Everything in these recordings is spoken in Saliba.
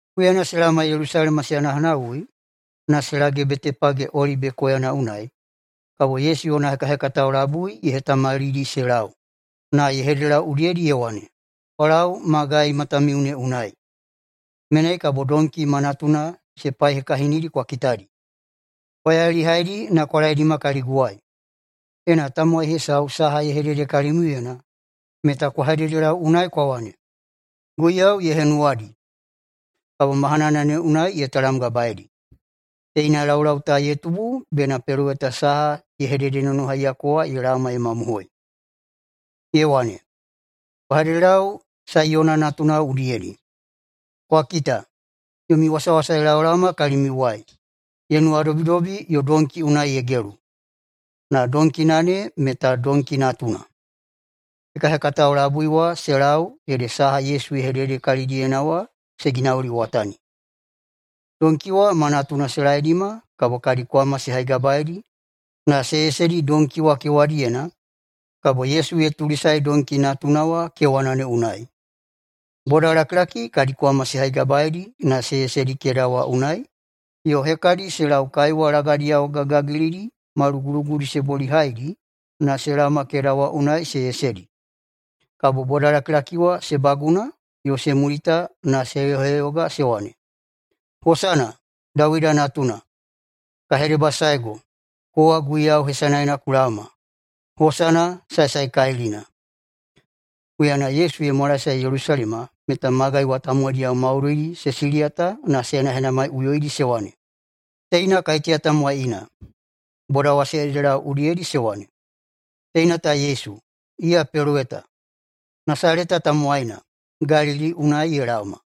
Huyana se laoma Yelusalema se hanahanawui na se lage Betepage Olibe koyana unai, kabo Yesu yona hekahekatao labui ye hetamalidi se lau na ye hededelau udiyedi ye wane, “Kwa lau magai matamiu ne unai. Menai kabo donki ma natuna se paihekahinidi kwa kitadi. Kwa yailihaidi na kwa laedima kaliguwai. Ena tamowai hesau saha ye hedede kalimiuyena, meta kwa hededelau unai kwa wane, ‘Guiyau ye henuwadi.’ Kabo mahanana ne unai ye talamgabaeidi.” Teina laulau ta ye tubu bena peloweta saha ye hededenonohaiyako wa ye laoma ye mamohoi. Ye wane, “Kwa hededelau Saiyona natunao udiyedi, ‘Kwa kita, yomi wasawasa ye laolaoma kalimiuwai, ye nuwadobidobi yo donki unai ye gelu, na donkina ne meta donki natuna.’” Hekahekatao labui wa se lau ede saha Yesu ye hedede kalidiyena wa se ginauliwatani. Donki wa ma natuna se laedima kabo kadi kwama se haigabaeidi na se yesedi donki wa kewadiyena kabo Yesu ye tulisae donki natuna wa kewana ne unai. Bodalakilaki kadi kwama se haigabaeidi na se yesedi keda wa unai yo hekadi se lau kaiwa lagadiyao gagigagilidi ma lugulugudi se bolihaidi na se laoma keda wa unai se yesedi. Kabo bodalakilaki wa se baguna yo se mulita na se heyoheyoga se wane, “Hosana, Dawida Natuna!” “Ka hedebasaego, kowa Guiyau hesanaena ku laoma!” “Hosana saesaekalilina!” Huyana Yesu ye mwalaesae Yelusalema meta magai wa tamowaidiyao maudoidi se siliyata na se henahenamaiꞌuyoidi se wane, “Teina kaiteya tamowai ina?” Boda wa se hededelau udiyedi se wane, “Teina ta Yesu, iya peloweta, Nasaleta tamowaina, Galili unai ye laoma.”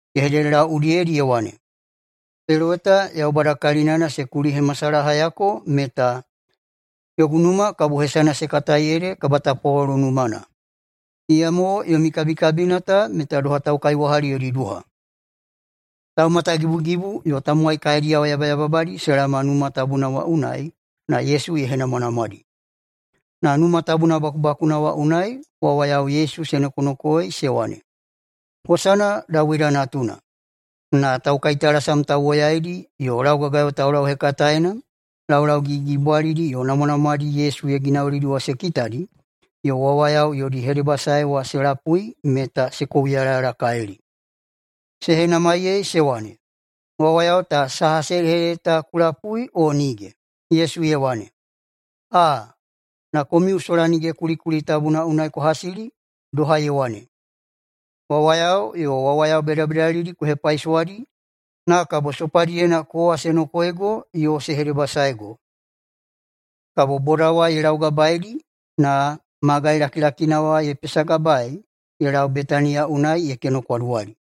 Ye hededelau udiyedi ye wane, “[Peloweta Yaubada kalinana] se kulihemasalahayako meta, ‘Yogu numa kabo hesana se katai ede kabatapwalolo numana’, iyamo yomi kabikabina ta meta doha ‘taukaiwahali yodi duha.’” Taumatagibugibu yo tamowai kaediyao yabayababadi se laoma Numa Tabuna wa unai na Yesu ye henamwanamwadi. Na Numa Tabuna bakubakuna wa unai wawayao Yesu se nokonokoei se wane, “Hosana Dawida Natuna!” Na taukaitalasam tauwoyaidi yo laugagayo taulauhekataena laulau gigigigibwalidi yo namwanamwadi Yesu ye ginaulidi wa se kitadi yo wawayao yodi hedebasae wa se lapui meta se kouyalayalakalili. Se henamaiyei se wane, “Wawayao ta saha se hedehedede ta ku lapui, o nige?” Yesu ye wane, “Aa, na komiu sola nige kulikuli tabuna unai kwa hasili? Doha ye wane, ‘Wawayao yo wawayao bedabedalidi ku hepaisowadi na kabo sopadiyena kowa se nokoeigo yo se hedebasaego.’” Kabo boda wa ye laugabaeidi na magai lakilakina wa ye pesagabaei ye lau Betaniya unai ye kenokwaduwali.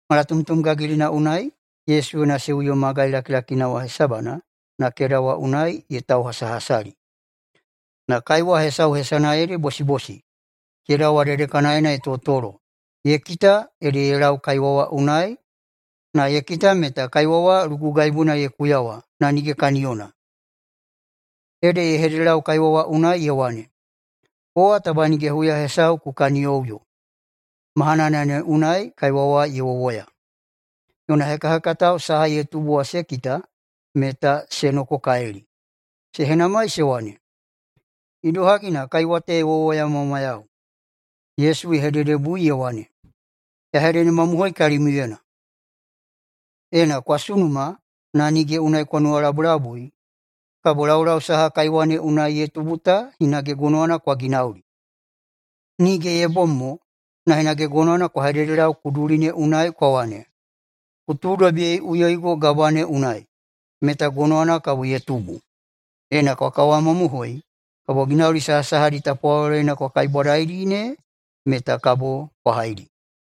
Malatomtom gagilina unai Yesu yona seuyo magai lakilakina wa hesabana na keda wa unai ye tauhasahasali. Na kaiwa hesau hesana ede bosibosi keda wa dedekanaena ye totolo ye kita ede ye lau kaiwa wa unai na ye kita meta kaiwa wa lugugaibuna ye kuyawa na nige kaniyona. Ede ye hededelau kaiwa wa unai ye wane, “Kowa taba nige huya hesau ku kaniyoꞌuyo.” Mahana ne unai kaiwa wa ye wowoya. Yona hekahekatao saha ye tubu wa se kita meta se nokokalili. Se henamai se wane, “Idohagi na kaiwa ta ye wowoyamwamwayau?” Yesu ye hededebui ye wane, “Ya hededemamohoi kalimiuyena: Ena kwa sunuma na nige unai kwa nuwalabulabui, kabo laulau saha kaiwa ne unai ye tubu ta hinage gonowana kwa ginauli. Nige ye bom mo, na hinage gonowana kwa hededelau kuduli ne unai kwa wane, ‘Ku tuudobiyeiꞌuyoigo gabwa ne unai!’, meta gonowana kabo ye tubu. Ena kwa kawamamohoi, kabo ginauli sahasahadi tapwaloloyena kwa kaibwadaidi ne meta kabo kwa haidi.”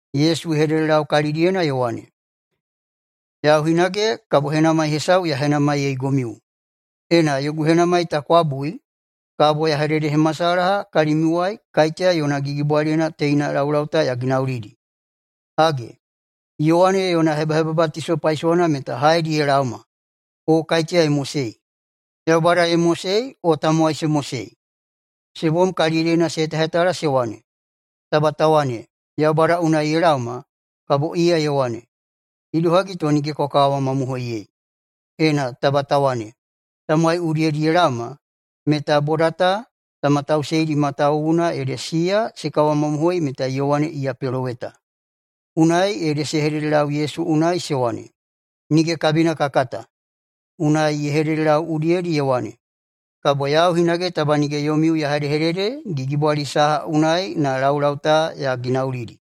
Yesu ye hededelau kalidiyena ye wane, “Yau hinage kabo henamai hesau ya henamaiyeigomiu. Ena yogu henamai ta kwa bui, kabo ya hededehemasalaha kalimiuwai kaiteya yona gigibwaliyena teina laulau ta ya ginaulidi. Hage, Yowane yona hebahebabatiso paisowana meta haedi ye laoma, [o kaiteya ye mosei]? Yaubada ye mosei o tamowai se mosei?” Se bom kalidiyena se hetahetala se wane, “Taba ta wane, ‘Yaubada unai ye laoma’, kabo iya ye wane, ‘Idohagi to nige kwa kawamamohoiyei?’ Ena taba ta wane, ‘Tamowai udiyedi ye laoma’, meta boda ta ta matausiyeidi matawuwuna ede siya se kawamamohoi meta Yowane iya peloweta.” Unai ede se hededelau Yesu unai se wane, “Nige kabina ka kata.” Unai ye hededelau udiyedi ye wane, “Kabo yau hinage taba nige yomiu ya hedehedede gigibwali saha unai na laulau ta ya ginaulidi.”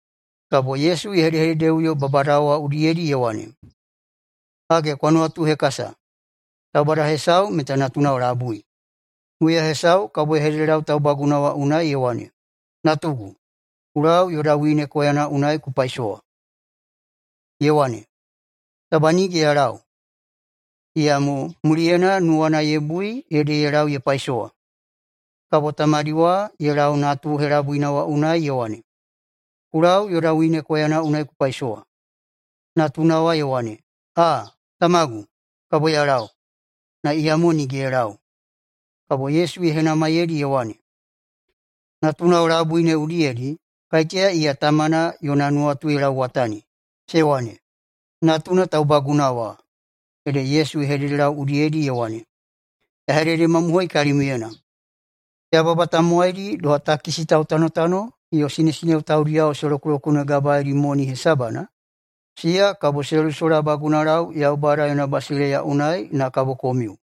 Kabo Yesu ye hedehededeꞌuyo babadao wa udiyedi ye wane, “Hage kwa nuwatuhekasa, taubada hesau meta natunao labui. Huya hesau kabo ye hededelau taubaguna wa unai ye wane, ‘Natugu, ku lau yoda wine koyana unai ku paisowa.’ Ye wane, ‘Taba nige ya lau.’ Iyamo muliyena nuwana ye bui ede ye lau ye paisowa. Kabo tamadi wa ye lau natuna helabuina wa unai ye wane, ‘Ku lau yoda wine koyana unai ku paisowa.’ Natuna wa ye wane, ‘Aa, tamagu, kabo ya lau.’ Na iyamo nige ye lau.” Kabo Yesu ye henamaiyeidi ye wane, “Natunao labui ne udiyedi, kaiteya iya tamana yona nuwatu ye lauwatani?” Se wane, “Natuna taubaguna wa.” Ede Yesu ye hededelau udiyedi ye wane, “Ya hededemamohoi kalimiuyena: Yababa tamowaidi doha takisi tautanotano yo sinesineo taudiyao se lokulokunegabaeidi moni hesabana, siya kabo se lusolabagunalau Yaubada yona basileiya unai na kabo komiu.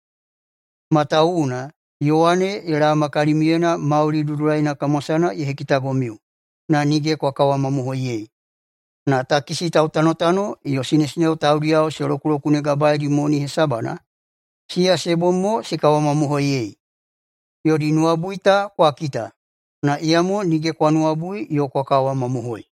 Matawuwuna Yowane ye laoma kalimiuyena mauli dudulaina kamwasana ye hekitagomiu, na nige kwa kawamamohoiyei, na takisi tautanotano yo sinesineo taudiyao se lokulokunegabaeidi moni hesabana, siya se bom mo se kawamamohoiyei. Yodi nuwabui ta kwa kita, na iyamo nige kwa nuwabui yo kwa kawamamohoi.”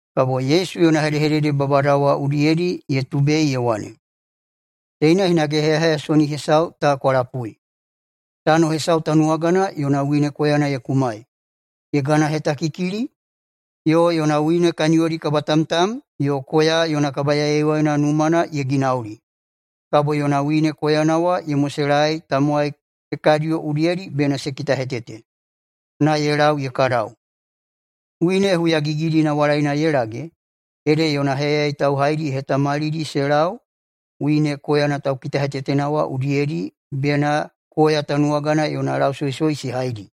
[Kabo Yesu yona hedehedede babadao wa udiyedi ye tubei ye wane,] “Teina hinage heyaheyasoni hesau ta kwa lapui. Tano hesau tanuwagana yona wine koyana ye kumai, ye ganahetakikili, yo yona wine kaniyodi kabatamtam yo koya yona kabayaiyaiwaina numana ye ginaulidi. Kabo yona wine koyana wa ye moselaei tamowai hekadiyo udiyedi bena se kitahetete, na ye lau ye kadau. Wine huyagigidi nawalaina ye lage ede yona heyayai tauhaidi ye hetamalidi se lau wine koyana taukitakitahetetena wa udiyedi bena koya tanuwagana yona lausoisoi se haidi.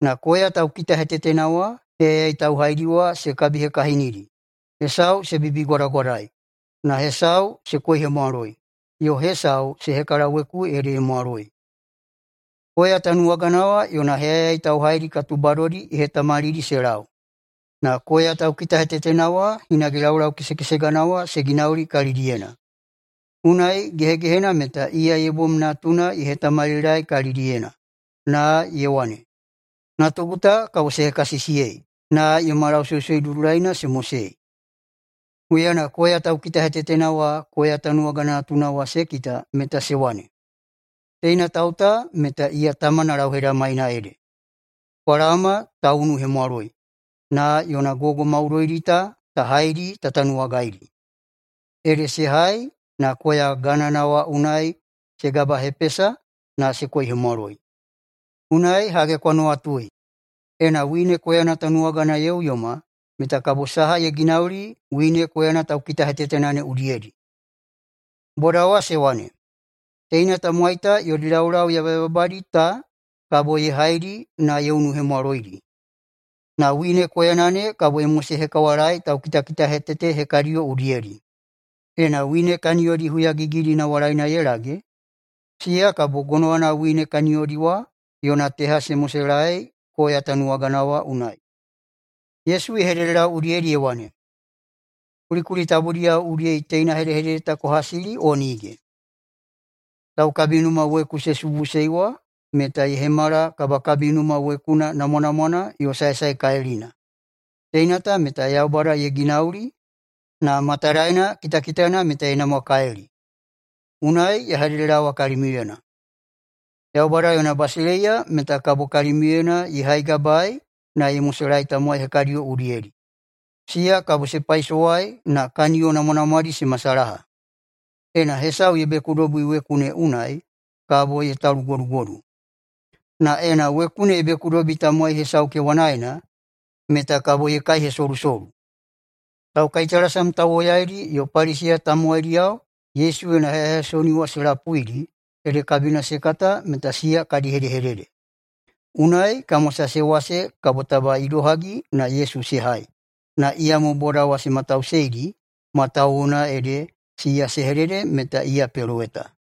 Na koya taukitahetetena wa heyayai tauhaidi wa se kabihekahinidi, hesau se bibigwadagwadai na hesau se koihemwaloi yo hesau se hekalaweku ede ye mwaloi. Koya tanuwagana wa yona heyayai tauhaidi katubadodi ye hetamalidi se lau, na koya taukitahetetena wa hinage laulau kesekesegana wa se ginauli kalidiyena. Unai gehegehena meta iya ye bom natuna ye hetamalilaei kalidiyena, na ye wane, ‘Natugu ta kabo se hekasisiyei [na yoma lausoisoi dudulaina se mosei].’ Huyana koya taukitakitahetetena wa koya tanuwagana natuna wa se kita meta se wane, ‘Teina tau ta meta iya tamana lauhedamaina ede, kwa laoma ta unuhemwaloi na yona gogo maudoidi ta haidi ta tanuwagaidi.’ Ede se hai na koya ganana wa unai se gabahepesa na se koihemwaloi. Unai hage kwa nuwatui, ena wine koyana tanuwagana ye uyoma meta kabo saha ye ginauli wine koyana taukitahetetena ne udiyedi?” Boda wa se wane, “Teina tamowai ta yodi laulau yabayababadi ta kabo ye haidi na ye unuhemwaloidi. Na wine koyana ne kabo ye mosehekawalaei taukitakitahetete hekadiyo udiyedi. Ena wine kaniyodi huyagigidi nawalaina ye lage, siya kabo gonowana wine kaniyodi wa yona teha se moselaei koya tanuwagana wa unai.” Yesu ye hededelau udiyedi ye wane, “Kulikuli tabudiyao udiyedi teina hedehedede ta kwa hasili o nige? ‘Taukabinuma weku se subuꞌusei wa meta ye hemala kabakabinuma wekuna namwanamwana yo saesaekalilina. Teina ta meta Yaubada ye ginauli, na matadaena kitakitana meta ye namwakalili.’ Unai ya hededelaowa kalimiuyena: Yaubada yona basileiya meta kabo kalimiuyena ye haigabaei na ye moselaei tamowai hekadiyo udiyedi, siya kabo se paisowai na kaniyo namwanamwadi se masalaha. Ena hesau ye bekudobi weku ne unai kabo ye talugodugodu, na ena weku ne ye bekudobi tamowai hesau kewanaena meta kabo ye kaihesolusolu.” Taukaitalasam tauwoyaidi yo Paliseya tamowaidiyao Yesu yona heyaheyasoni wa se lapuidi ede kabina se kata meta siya kadi hedehedede. Unai kamwasa se wase kabo taba idohagi na Yesu se hai, na iyamo boda wa se matauseidi matawuwuna ede siya se hedede meta iya peloweta.